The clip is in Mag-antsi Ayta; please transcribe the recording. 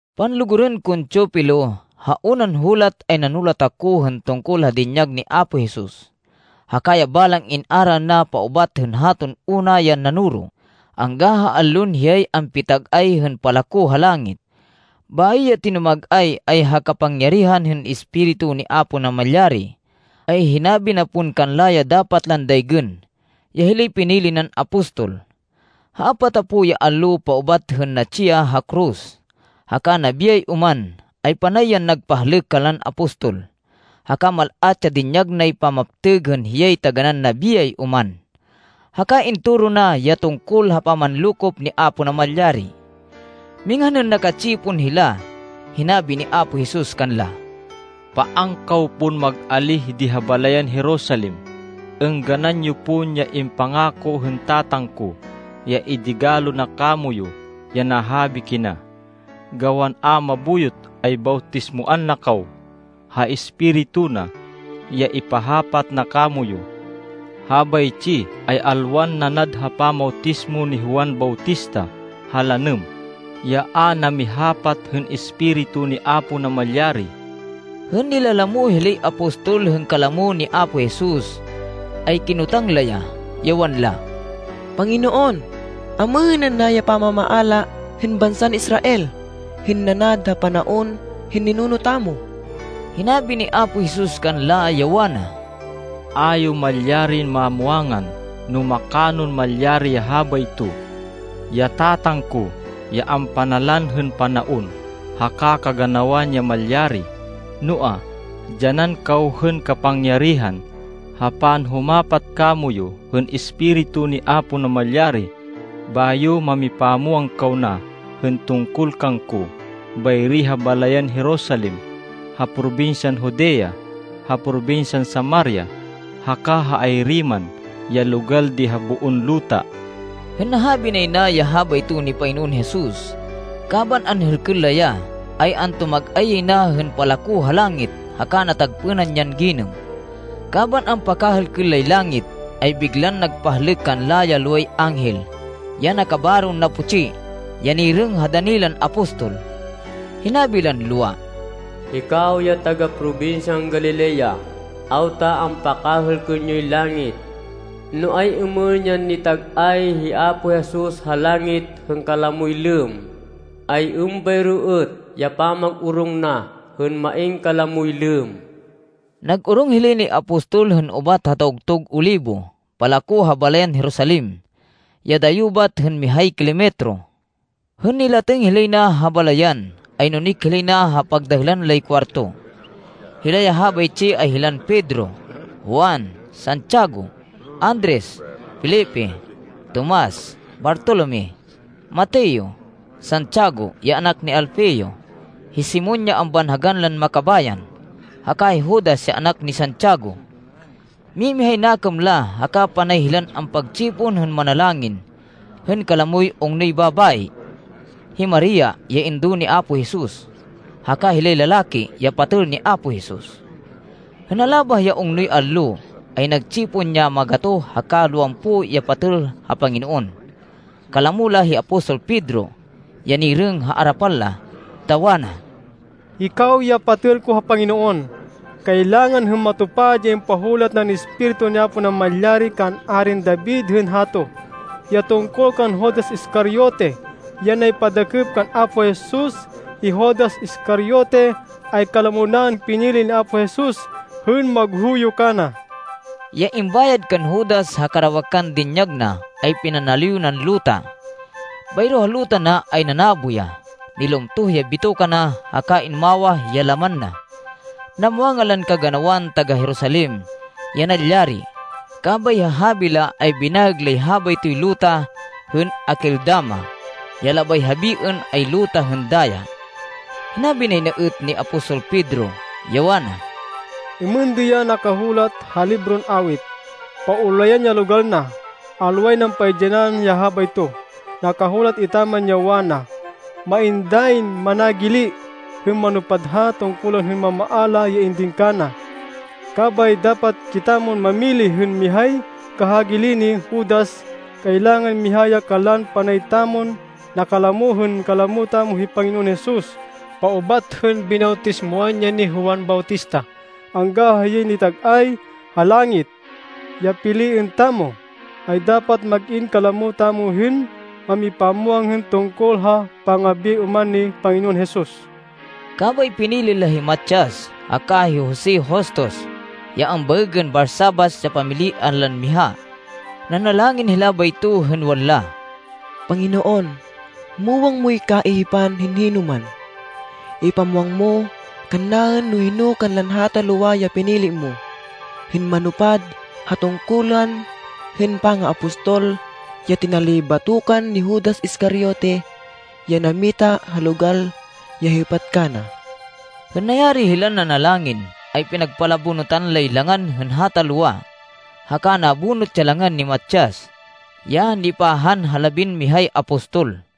Panlugurên kon Teofilo, ha unan hulat, ay nanulat ako hên tungkol ha dinyag ni Apo Jesus, haka ya balang in-aral na paubat hên haton una yan nanoro angga ha allon hiyay ampitag-ay hên palako ha langit. Bayo ya tinumag-ay, ay ha kapangyarihan hên Espiritu ni Apo Namalyari, ay hinabi na pon kanla ya dapat lan daygên, ya hilay pinili nan apostol. Ha apatapo ya allo paubat hên natsi ya ha koros haka nabiyay oman, ay panay yan nagpahlêk kanlan apostol, haka mal-at ya dinyag nay pamaptêg hên hiyay taganán nabiyay oman. Haka intoro na ya tungkol ha pamanlokop ni Apo Namalyari. Minghan hên naka-tsipon hila, hinabi ni Apo Jesus kanla, “Paan kaw pon mag-alíh di ha balayan Jerusalem. Êngganan yo pon ya impangako hên Tatang ko, ya idigalo na kamoyu ya nahabi kina. Gawan a mabuyot, ay bawtismoan na kaw ha Espiritu na, ya ipahapat na kamoyu. Habaytsi ay alwan nanad ha pamawtismo ni Juan Bautista ha lanêm, ya a namihapat hên Espiritu ni Apo Namalyari.” Hên nilalamo hilay apostol hên kalamo ni Apo Jesus, ay kinotang la ya, ya wanla, “Panginoon, amêhên ana ya pamamaala hên bansan Israel hên nanad ha panaon hên ninuno tamo?” Hinabi ni Apo Jesus kanla, ya wana, “A yo malyarin mamwangan no makanon malyari ya habayto. Ya Tatang ko ya ampanalan hên panaon haka kaganawan ya malyari. Noa, dyanan kaw hên kapangyarihan ha panhumapat kamoyu hên Espiritu ni Apo Namalyari bayo mamipamwang kaw na hên tungkol kangko bayri ha balayan Jerusalem, ha probinsyan Judea, ha probinsyan Samaria, haka ha ayri man ya logal di ha boon luta.” Hên nahabi nay na ya habayto ni Panginoon Jesus, kaban anhêlkên la ya, ay antumag-ay yay na hên palako ha langit haka natagpênan yan ginêm. Kaban ampakahêlkên lay langit, ay biglan nagpahlêk kanla ya loway anghel ya nakabaron naputsi ya nirêng ha dani lan apostol. Hinabi lan lowa, “Hikaw ya taga-probinsyan Galilea, awta ampakahêlkên yoy langit! No ay-êmên yan nitag-ay hi Apo Jesus ha langit hên kalamoy lêmm, ay êmbayro êt ya pamag-orong na hên main kalamoy lêmm.” Nag-orong hilay nay apostol hên ubat ha Tawgtug Olibo palako ha balayan Jerusalem, ya dayo bat hên mihay kilometro. Hên nilatêng hilay na ha balayan, ay nunik hilay na ha pagdahêlan lay kuwarto. Hila ya habaytsi ay hilan Pedro, Juan, Santiago, Andres, Felipe, Tomas, Bartolome, Mateo, Santiago, ya anak ni Alfeo, hi Simon ya ambanhagan lan Makabayan, haka hi Judas ya anak ni Santiago. Mimihay nakêm la haka panay hilan ampagtsipon hên manalangin hên kalamoy ungnoy babayi, hi Maria ya indo ni Apo Jesus, haka hilay lalaki, ya patêl ni Apo Jesus. Hên nalabah ya ungnoy allo, ay nagtsipon ya magatoh haka lowampo ya patêl ha Panginoon. Kalamo la hi apostol Pedro ya nirêng ha arapan la, ta wana, “Hikaw ya patêl ko ha Panginoon, kailangan hên matupad ya impahulat nan Espiritu ni Apo Namalyari kan Arin David hên hato, ya tungkol kan Judas Iscariote, ya naypadakêp kan Apo Jesus. Hi Judas Iscariote, ay kalamo naên pinili ni Apo Jesus hên maghuyo kana.” (Ya imbayad kan Judas ha karawakan dinyag na, ay pinanaliw nan luta. Bayro ha luta na ay nanabo ya. Nilumtoh ya bitoka na haka inumawah ya laman na. Namwangan lan kaganawan taga-Jerusalem ya nalyari, kabay ha habi la ay binaêg lay habaytoy luta hên Akeldama, ya labay habiên ay Luta hên Daya.) Hinabi nay na êt ni apostol Pedro, ya wana, “Êmên di ya nakahulat ha libron Awit, ‘Paulayan ya logal na. Alway nan paidyanan ya habayto.’ Nakahulat etaman ya wana, ‘Main dayin managili hên manupad ha tungkulan hên mamaala ya indin kana.’ “Kabay dapat kitamon mamili hên mihay kahagili ni Judas. Kailangan miha ya kanlan panay tamon nakalamo hên kalamo tamo hi Panginoon Jesus, paubat hên binawtismoan ya ni Juan Bautista angga ha hiyay nitag-ay ha langit. Ya piliên tamo, ay dapat mag-in kalamo tamo hên mamipamwang hên tungkol ha pangabiyay oman ni Panginoon Jesus.” Kabay pinili la hi Matias haka hi Jose Justus ya ambaêgên Barsabas ya pamilian lan miha. Nanalangin hila bayto hên wanla, “Panginoon, muwang moy kaihipan hên hinoman. Ipamwang mo kannaên no hino kanlan hata lowa ya pinili mo hên manupad ha tungkulan hên pangaapostol ya tinalibatokan ni Judas Iscariote, ya nammita ha logal ya hêpat kana.” Hên nayari hilan nanalangin, ay pinagpalabonutan lay langan hên hata lowa, haka nabonut ya langan ni Matias, ya nipahan ha labinmihay apostol.